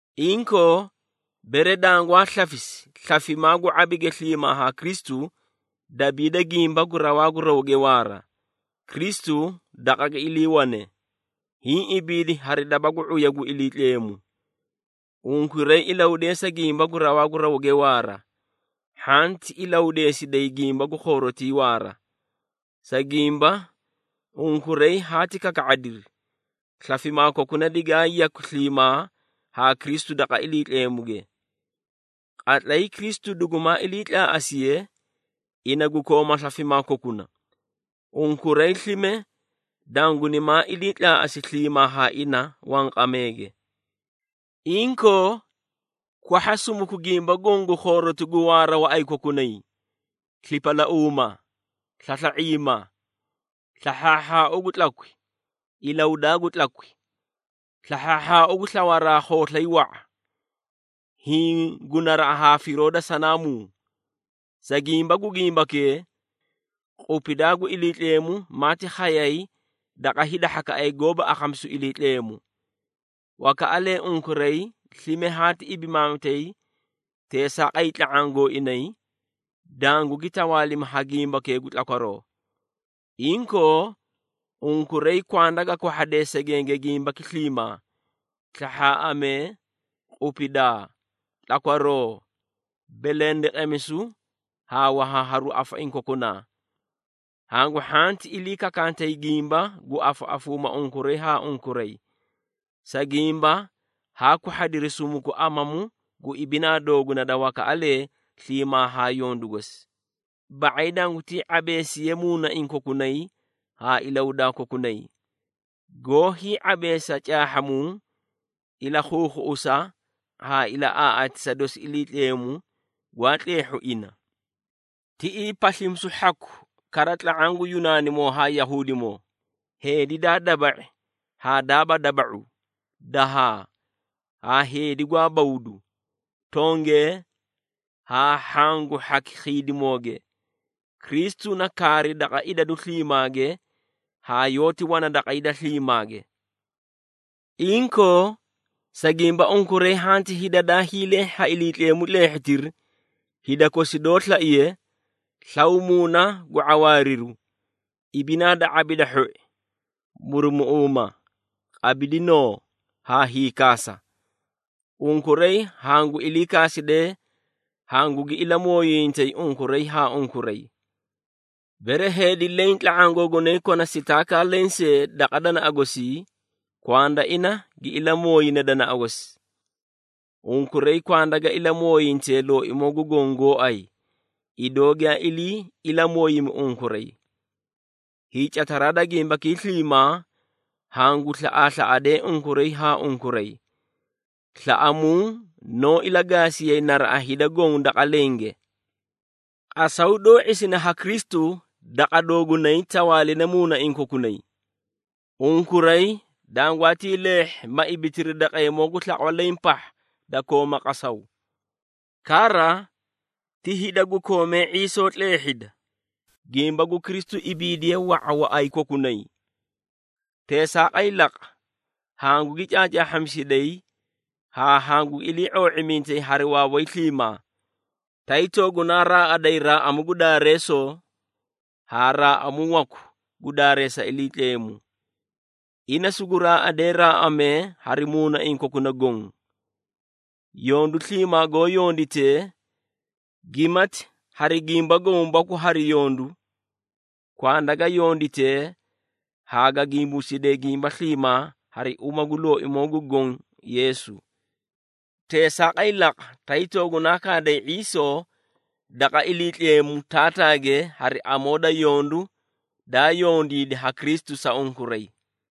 Inkoo, bere dangwaa slafisi slafimaa gu ⁄abige sliimaa haa Kristu, dabiida gimba gu rawaa gu rawge waara, Kristu daqa gi iliiwane, hiĩ ibiidi hari daba gu ⁄uya gu Iliitleemu. Unkuray ilahudeesa gimba gu rawaa gu rawge waara, hhanti ilahudeesiday gimba gu khoorotii waara. Sa gimba, unkuray haati kaka⁄adiri, slafimaa kokuna digaa yakwi sliimaa haa Kristu daqa Iliitleemuge. Qatlay Kristu dugumaa iliitlaaꞌasiye, ina gu kooma slafimaa kokuna, unkuray slime dangunimaa ilii tlaaꞌasi sliimaa haa ina wanqameege. Inkoo, kwahha sumuku gimba goõ gu khooroti gu waara waꞌay kokunay, slipalauuma, slasla⁄iima, slahhaahhaau gu tlakwi, ilahudaa gu tlakwi, slahhaahhaau gu slawaraa khooslay wa⁄a, hiĩ gu naraꞌa haa firoo da sanaamuu. Sa gimba gu gimbakee, qupidaa gu Iliitleemu maati khayay daqa hida hhakaꞌay gooba akhamisu Iliitleemu. Wakaꞌalee, unkuray slime haati ibimaamitay teesaaqay tla⁄aã gooinay, dangugi tawaalimi ha gimbakee gu tlakwaroo. Inkoo, unkuray kwanda ga kwahhadee segenge gimbaki sliimaa, slahhaaꞌamee, qupidaa, tlakwaroo, belendeqemisu haa wahaaharu afaiĩ kokunaa. Hangu hhanti ilii kakantay gimba gu afaꞌafuuma unkuray haa unkuray, sa gimba haa kwahhadiri sumuku amamu gu ibinaa dooguna da wakaꞌalee sliimaa haa yondu gosi. Ba⁄ay dangutii ⁄abeesiye muunaiĩ kokunay haa ilahudaa kokunay, goó hii⁄abeesa caahhamuu, ilakhuukhuꞌusa haa ilaꞌaaꞌaatisa dosi Iliitleemu, gwaa tleehhu ina. Tiꞌii paslimisu hhaku kara tla⁄aã gu Yunaanimoo haa Yahuudimoo, heedi daa daba⁄i haa daaba daba⁄u, dahaa, haa heedi gwaa bawdu, tongee haa hhaã gu hhaki khiidimooge. Kristu na kaari daqa idadu sliimaage haa yoóti wana daqa hida sliimaage. Inkoo, sa gimba unkuray hanti hida daa hiileehhi ha Iliitleemu tleehhitiri, hida kosi doó slaiye, slaw muuna gu ⁄awaariru, ibinaa da ⁄abi da hhoi, murumuꞌuuma, qabidinoo, haa hiikaasa. Unkuray hangu ilii kaasidee hangugi ilamooyiiyintayi unkuray haa unkuray. Bere heedi leẽ tla⁄aã googunay kona sitaakaa lensee daqa danaꞌa gosii, kwanda ina gi ilamooyine danaꞌa gosi. Unkuray kwanda ga ilamooyintee Looimoo gu Goõ gooay, idoo giyaa ilii ilamooyimi unkuray. Hiicataraa da gimbakii sliimaa, hangu slaꞌaaslaꞌadee unkuray haa unkuray. Slaꞌamuu noó ilagaasiyay naraꞌa hida goõ daqa lenge. Qasaw doó ⁄isine ha Kristu daqa doogunay tawaaline muunaiĩ kokunay. Unkuray dangwaatii leehhi ma ibitiri daqeemoo gu slaqwa leẽ pahha da kooma qasaw. Kara ti hida gu koomee ⁄iisoo tleehhida. Gimba gu Kristu ibiidiye wa⁄a waꞌay kokunay. Teesaaqay laqa, hangugi caacaahhamisiday haa hangugi ilii⁄oo⁄imintay hari waaway sliimaa, tay toogunaa raaꞌaday raaꞌamu gu Daareesoo haa raaꞌamu waku gu daareesa Iliitleemu. Ina sugu raaꞌadee raaꞌamee hari muunaiĩ kokuna goõ. Yondu sliimaa goó yonditee, gimati hari gimba goõ baku hari yondu, kwanda ga yonditee haa ga gimbuusidee gimba sliimaa hari uma gu Looimoo gu Goõ Yeesu. Teesaaqay laqa, tay toogunaa kaaday ⁄iisoo daqa Iliitleemu Taataage hari amoo da yondu daa yondiidi ha Kristu sa unkuray.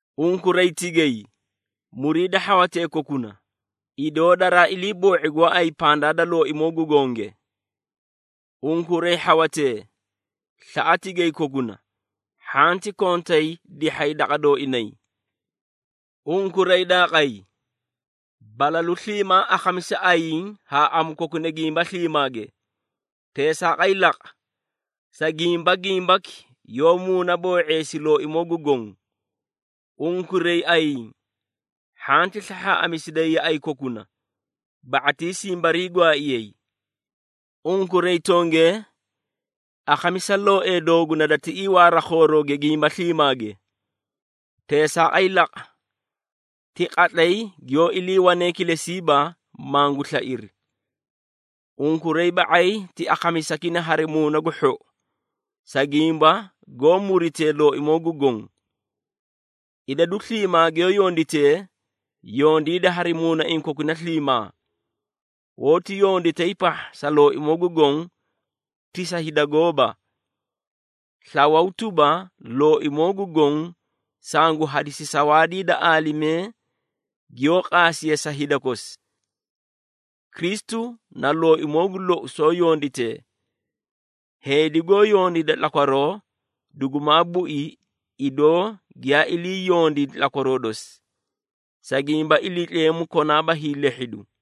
Unkuray tigay, muriida hhawatee kokuna, idoo daraa iliiboo⁄i gooay pandaa da Looimoo gu Gonge. Unkuray hhawatee, slaꞌa tigay kokuna, hhanti kontay dihhay daqa dooinay. Unkuray daaqay, balalu sliimaa akhamisa ayiĩ haa amu kokuna gimba sliimaage. Teesaaqay laqa, sa gimba gimbaki yoó muunaboo⁄eesi Looimoo gu Goõ. Unkuray ayiĩ, hhanti slahhaaꞌamisiday yaꞌay kokuna, ba⁄atii simbarii gwaaiyay. Unkuray tongee, akhamisa looee dooguna da tiꞌii waaraa khoorooge gimba sliimaage. Teesaaqay laqa ti qatlay giyoó iliiwanee kilesiiba, mangu slairi. Unkuray ba⁄ay ti akhamisakina hari muuna gu hhou, sa gimba goó muritee Looimoo gu Goõ. Idadu sliimaa giyoó yonditee, yondiida hari muunaiĩ kokuna sliimaa, hoóti yonditay pahha sa Looimoo gu Goõ, ti sa hida gooba. Slawaw tuba, Looimoo gu Goõ sangu hadisi sawaadii da aalimee giyoó qaasiye sa hida kosi. Kristu na Looimoo gu lou soó yonditee. Heedi goó yondiida tlakwaroo, dugumaa bui idoo giyaa ilii yondiidi tlakwaroo dosi, sa gimba Iliitleemu konaaba hiilehhidu.